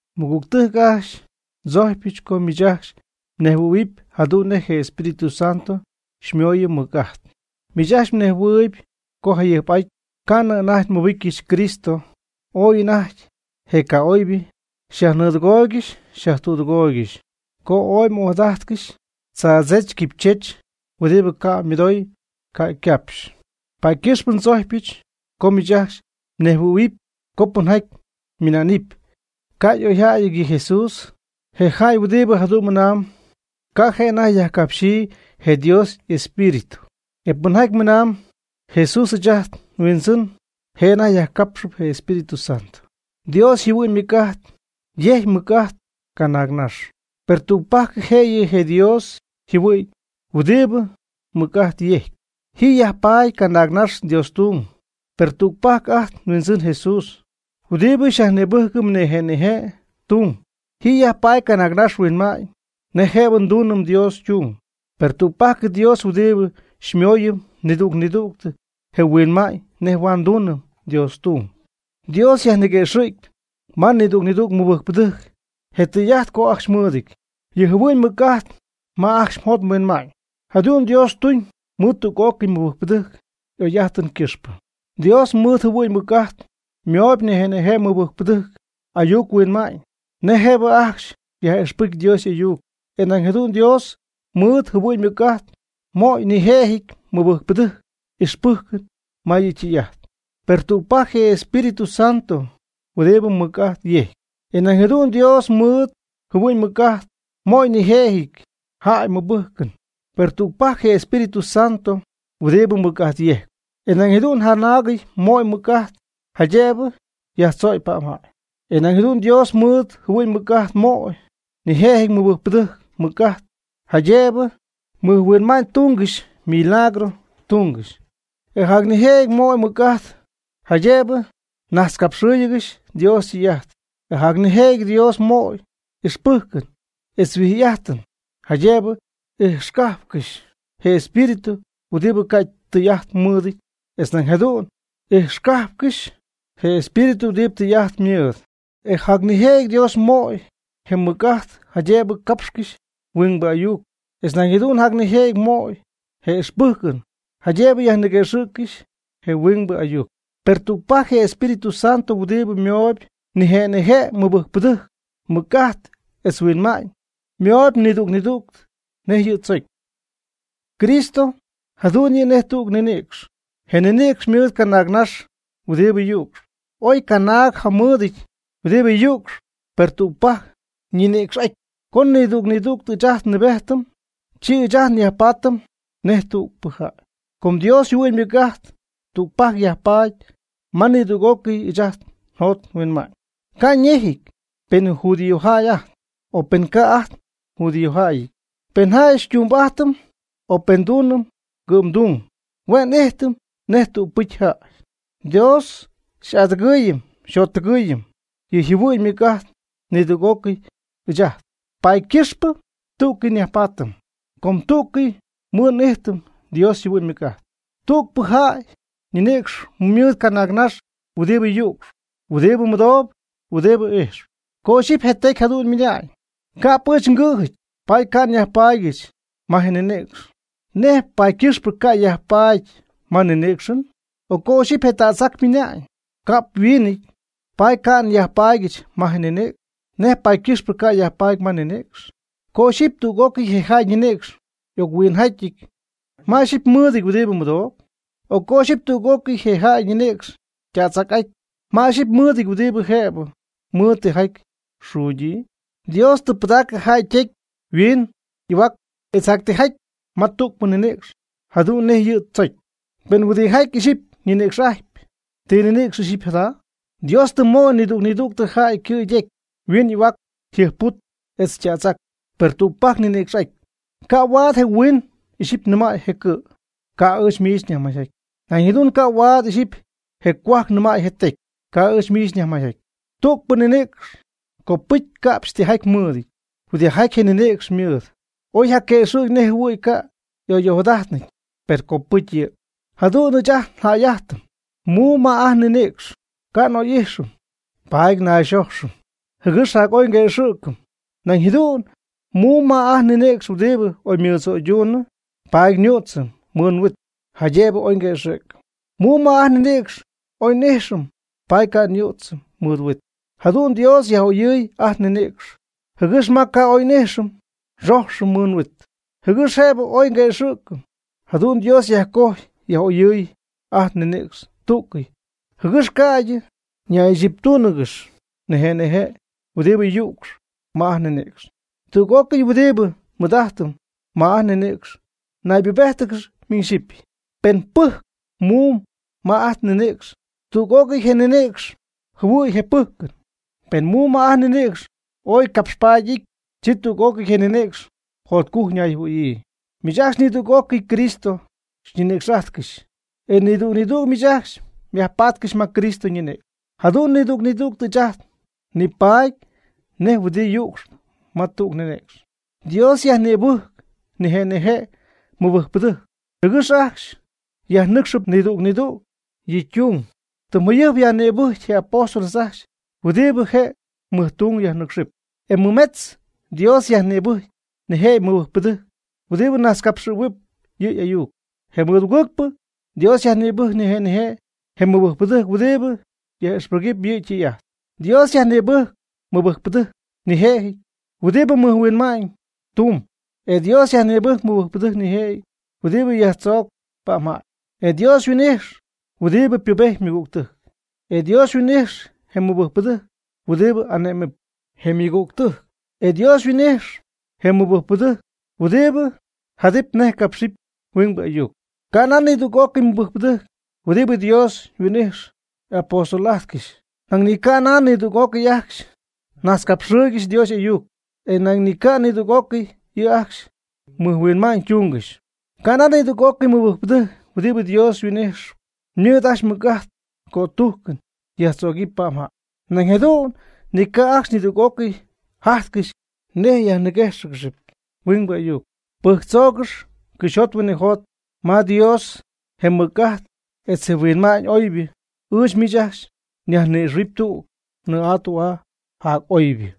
Mɨgügtɨjc ajcxy, ndzojcypɨch co miich ajcxy mnejhuɨ̈huɨpy jadu'n nej je Espíritu Santo xymooyɨm mɨc'ajt. Miich ajcxy mnejhuɨɨyb co jayɨjp'ajty co ca'nɨ anajty mmɨbɨjccɨxy Cristo, ooy anajty je ca'oybɨ xyajnɨɨdɨgooygɨxy xyajtüdɨgooygɨxy, co m'ojadajtcɨxy tzaadzech quipychech huɨdibɨ ca' ymɨdoy ca' ycapxy. Paady ycɨxpɨ ndzojcpɨch co miich ajcxy mnejhuɨ̈huɨpy co pɨnjaty ymɨna'nɨpy: “¡Ca' oy jäy yɨ Jesús!” je jäy huɨdibɨ jadu'n mɨnamb, ca' je' anajty yajcapxyii je Dios y'Espíritu. E pɨnjaty mɨnamb: “¡Jesús ɨɨch ajt nHuindzɨn!” je' anajty yajcapxɨp je Espíritu Santo. Dios yjɨhuɨ'ñ ymɨc'ajt yejcpy ymɨc'ajt canaag nax, per tügpajc jëyɨ je Dios yjɨhuɨ'ñ huɨdibɨ mɨc'ajt yejcp. Ji yajpaady canaagnax Dios ytung, per tügpajc ajt nHuindzɨn Jesús huɨdibɨ xyajnïbɨjcɨm nije' nije' tung. Ji yajpaady canaagnax huinma'ñ nej jëbɨ ndunɨm Dios ytung. Per tügpajc Dios huɨdibɨ xymooyɨm nidüg nidüg je nhuinma'ñ nej huaad ndunɨm Dios ytung. Dios yajniguëxɨ̈gyp ma nidüg nidüg mɨbɨjcpɨdɨjc je tɨy'ajt co ajcxy mɨɨdɨty yɨ' yjɨhuɨ'ñ ymɨc'ajt ma ajcxy yjot yhuinma'ñ. Jadu'n Dios ytuñ mɨɨd tüg'ócɨy ymɨbɨjcpɨdɨjc y'oy'ajtɨn ycɨxpɨ. Dios mɨɨd yjɨhuɨ'ñ ymɨc'ajt ymooyb nijëjɨty mɨbɨjcpɨdɨjc ayuc huinma'ñ nej jëbɨ ajcxy yaj'ixpɨcy Dios y'ayuc. E nañ jadu'n Dios mɨɨd yjɨhuɨ'ñ ymɨc'ajt möy nijëjɨty mɨbɨjcpɨdɨjc ixpɨjcɨn ma yɨ' ytɨy'ajt, per tügpajc je Espíritu Santo huɨdibɨ mɨc'ajt yejcp. E nañ jadu'n Dios mɨɨd yjɨhuɨ'ñ ymɨc'ajt möy nijëjɨty jäy mɨbɨjcɨn, per tügpajc je Espíritu Santo huɨdibɨ mɨc'ajt yejcpy. E nañ jadu'n jacnaagɨty möy mɨc'ajt jaydëbɨ yajtzögy pa'mjäy. E nañ jadu'n Dios mɨɨd yjɨhuɨ'ñ ymɨc'ajt ymooyb nijëjɨty mɨbɨjcpɨdɨjc mɨc'ajt, jaydëbɨ mɨjhuinma'ñytúngɨxy milagro tungɨxy. E jac nijëjɨty ymooyb mɨc'ajt, jaydëbɨ najtzcapxɨɨygɨxy Dios ytɨy'ajt. E jac nijëjɨty Dios ymooyb ixpɨjcɨn etz huijy'ajtɨn, jaydëbɨ ijxcajpcɨxy je espíritu huɨdibɨ ca' tɨy'ajt mɨɨdɨty, etz nañ jadu'n ijxcajpcɨxy je espíritu huɨdibɨ tɨy'ajt mɨɨdɨp. E jac nijëjɨty Dios ymooyb je mɨc'ajt, jaydëbɨ capxcɨxy huingbɨ ayuc, etz nañ jadu'n jac nijëjɨty ymooyb je ixpɨjcɨn jaydëbɨ yajnïguejcɨxy je huingbɨ ayuc. Per tügpajc je Espíritu Santo huɨdibɨ ymooyb nije' nije' mɨbɨjcpɨdɨjc mɨc'ajt etz huinma'ñ. Ymooyb nidüg nidüg nej yɨ' tzocy. Cristo jadu'n yɨ' nej tüg ninïcx, je ninïcx ymɨɨd canaag nax huɨdibɨ yu'cxp. Oy canaag jamɨɨdɨty huɨdibɨ yu'cxp, per tügpajc ñinïcx'aty. Co nidüg nidüg ɨɨch ajt nnɨɨbejtɨm, chi ɨɨch ajt nyajpaatɨm nej tügpɨcy jäy. Com Dios yjɨhuɨ'ñ ymɨc'ajt tügpajc yajpaady ma nidüg'ócɨyɨ ɨɨch ajt njot nhuinma'ñ, ca' ñejɨty pen judíojäy ajt, o pen ca' ajt njudíojäyɨty; pen jäy xytumbɨ'ajtɨm o pen ndunɨm ngɨ'mdung; hue' n'ijtɨm nej tügpɨcy jäy. Dios xy'adɨgɨɨyɨm xyjottɨgɨɨyɨm yɨ' yjɨhuɨ'ñ ymɨc'ajt nidüg'ócɨy ɨɨch ajt, paady ycɨxpɨ tú'cɨy nyajpaatɨm, com tú'cɨy nmɨ'ijtɨm Dios yjɨhuɨ'ñ ymɨc'ajt. Tügpɨ jäy ñinïcx mɨɨd canaagnax huɨdibɨ yu'cxp, huɨdibɨ mɨdoob, huɨdibɨ ijxp. Co ixyipy je tecy jadu'n ymɨna'ñ: “Ca'p ɨɨch ngɨ̈jɨty, paady ca' nyajpaadyɨch ma je ninïcx.” ¿Nej paady ycɨxpɨ ca' yajpaady ma ninïcxɨn? O co ixyipy je tädzac ymɨna'ñ: “Ca'p nhuiinɨty, paady ca' nyajpaadyɨch ma je ninïcx.” ¿Nej paady ycɨxpɨ ca' yajpaady ma ninïcxɨn? Co ixyipy tüg'ócɨy je jäy ñinïcx y'oc-huin'aty, ¿ma ixyipy mɨɨdɨty huɨdi mɨdooyb? O co ixyɨpy tüg'ócɨy je jäy ñinïcx ytädzac'aty, ¿ma ixyipy mɨɨdɨty huɨdibɨ jëbɨ mɨɨd tijaty xuugyii? Dios tɨ pɨdacɨ jäy ytecy yhuin y'ahuac etz jac tijaty ma tügpɨ ninïcx jadu'n nej yɨ' tzojcy. Pen huiindɨ'ajty ixyipy ninïcx'ajtp, ¿ti ninïcx ixyipy jada? Dios tɨ möy nidüg nidüg jäy ycɨ' ytecy, yhuiin y'ahuac, yjɨjpput etz ytädzac, per tügpajc ñinïcx'aty. Ca' huaad je huiin ixyipy nɨmäy je cɨ': “Ca' ɨɨch miich nyajmayjaty.” Nañ jadu'n ca' huaad ixyipy je cohuajc nɨmay je tecy: “Ca' ɨɨch miich nyajmayjaty.” Tügpɨ ninïcx copɨcy ca'pxy tijaty mɨɨd. Huɨdijaty je ninïcx ymɨɨd oy yjaquëxɨ̈gy nej jɨhuɨ̈y ca' y'oy'ojadajtnɨty, per copɨcy yɨ'. Jadu'n ɨɨch ajt njäy'ajtɨm. Muum ma ajt nninïcx ca' oy n'ijxɨm, paady nayxojxɨm, jɨgɨx jac'oy quëxɨ̈gɨp. Nañ jadu'n muum ma ajt nninïcx huɨdi y'oymɨdzo'ydunɨ, paady nyüdzɨm mɨɨd huit, jaydëbɨ oy quëxɨ̈gɨty. Muum ma ajt nninïcx oy n'ijxɨm paady ca' nyüdzɨm mɨɨd huit. Jadu'n Dios yaj'oyɨɨy ajt nninïcx, jɨgɨx ma ca' oy y'ijxɨty, nxojxɨm mɨɨd huit, jɨgɨx jëbɨ oy quëxɨ̈gy. Jadu'n Dios yajcojy yaj'oyɨɨy ajt nninïcx tú'cɨy, jɨgɨx ca'ydɨ ñaychiptúnɨgɨxy nije' nije' huɨdibɨ yücx ma ajt nninïcx. Tüg'ócɨy huɨdibɨ nmɨɨd'ajtɨm ma ajt nninïcx naybubéjtɨgɨxp miñ xyipy. Pen pɨjcp muum ma je ninïcx, tüg'ócɨy je ninïcx jɨhuɨ̈y je pɨjcɨn. Pen muum ma ajt nninïcx ooy capxpaady y'ity, chi tüg'ócɨy je ninïcx jotcujc ñayjɨhuɨ̈yii. Miich ajcxy nidüg'ócɨy Cristo xyñinïcx'ajtcɨxyp, e nidüg nidüg miich ajcxy myajpatcɨxy ma Cristo ñinïcx. Jadu'n nidüg nidüg ɨɨch ajt nipaady nej huɨdi yücxp ma tüg ninïcx. Dios yajnïbɨcjpy nije' nije' mɨbɨjcpɨdɨjc, jɨgɨx ajcxy yajnɨcxɨp nidüg nidüg yɨ' ytung. Tɨm jayɨjp yajnïbɨjcy je apóstol ajcxy huɨdibɨ je mɨjtung yajnɨcxɨp. E mɨmetz Dios yajnïbɨjcy nijëjɨty mɨbɨjcpɨdɨjc huɨdibɨ najtzcapxɨɨyb yɨ' y'ayuc, je mɨdugɨɨgpɨ Dios yajnïbɨjcy nije' nije' je mɨbɨjcpɨdɨjc huɨdibɨ yaj'ixpɨjcp yɨ' ytɨy'ajt. Dios yajnïbɨjcy mɨbɨjcpɨdɨjc nijëjɨty huɨdibɨ mɨj huinma'ñ tumb. E Dios yajnïbɨjcy mɨbɨjcpɨdɨjc nijëjɨty huɨdibɨ yajtzoocp pa'mjäy. E Dios yhuin'ijx huɨdibɨ pubejtp ymɨgügtɨjc. E Dios yhuin'ijx je mɨbɨjcpɨdɨjc huɨdibɨ ane'mɨp je ymɨgügtɨjc. E Dios yhuin'ijx je mɨbɨjcpɨdɨjc huɨdibɨ jadɨp nej capxɨp huingbɨ ayuc. Ca' nan nidüg'ócɨy mɨbɨjcpɨdɨjc huɨdibɨ Dios huin'ijxyp y'apóstol'ajtcɨxy. Nañ ni ca' nan nidüg'ócɨy ajcxy najtzcapxɨɨygɨxy Dios y'ayuc. E nañ ni ca' nidüg'ócɨy yɨ' ajcxy mɨjhuinma'ñytungɨxy. Ca' nan nidüg'ócɨy mɨbɨjcpɨdɨjc huɨdibɨ Dios huin'ijxɨp ymɨɨd ajcxy mɨc'ajt cötujc yajtzögɨpy pa'mjäy. Nañ jadu'n ni ca' ajcxy nidüg'ócɨy jajtcɨxy nej yajnïguéjcɨxɨpy huingbɨ ayuc. Pɨjctzoogɨx cɨxyjot huinɨjot ma Dios je mɨc'ajt etz je huinma'ñ oybɨ. Ɨɨch miich ajcxy nyajnïxɨ̈huɨpy tüg nɨɨ'aa tü'aa jac'oybɨ.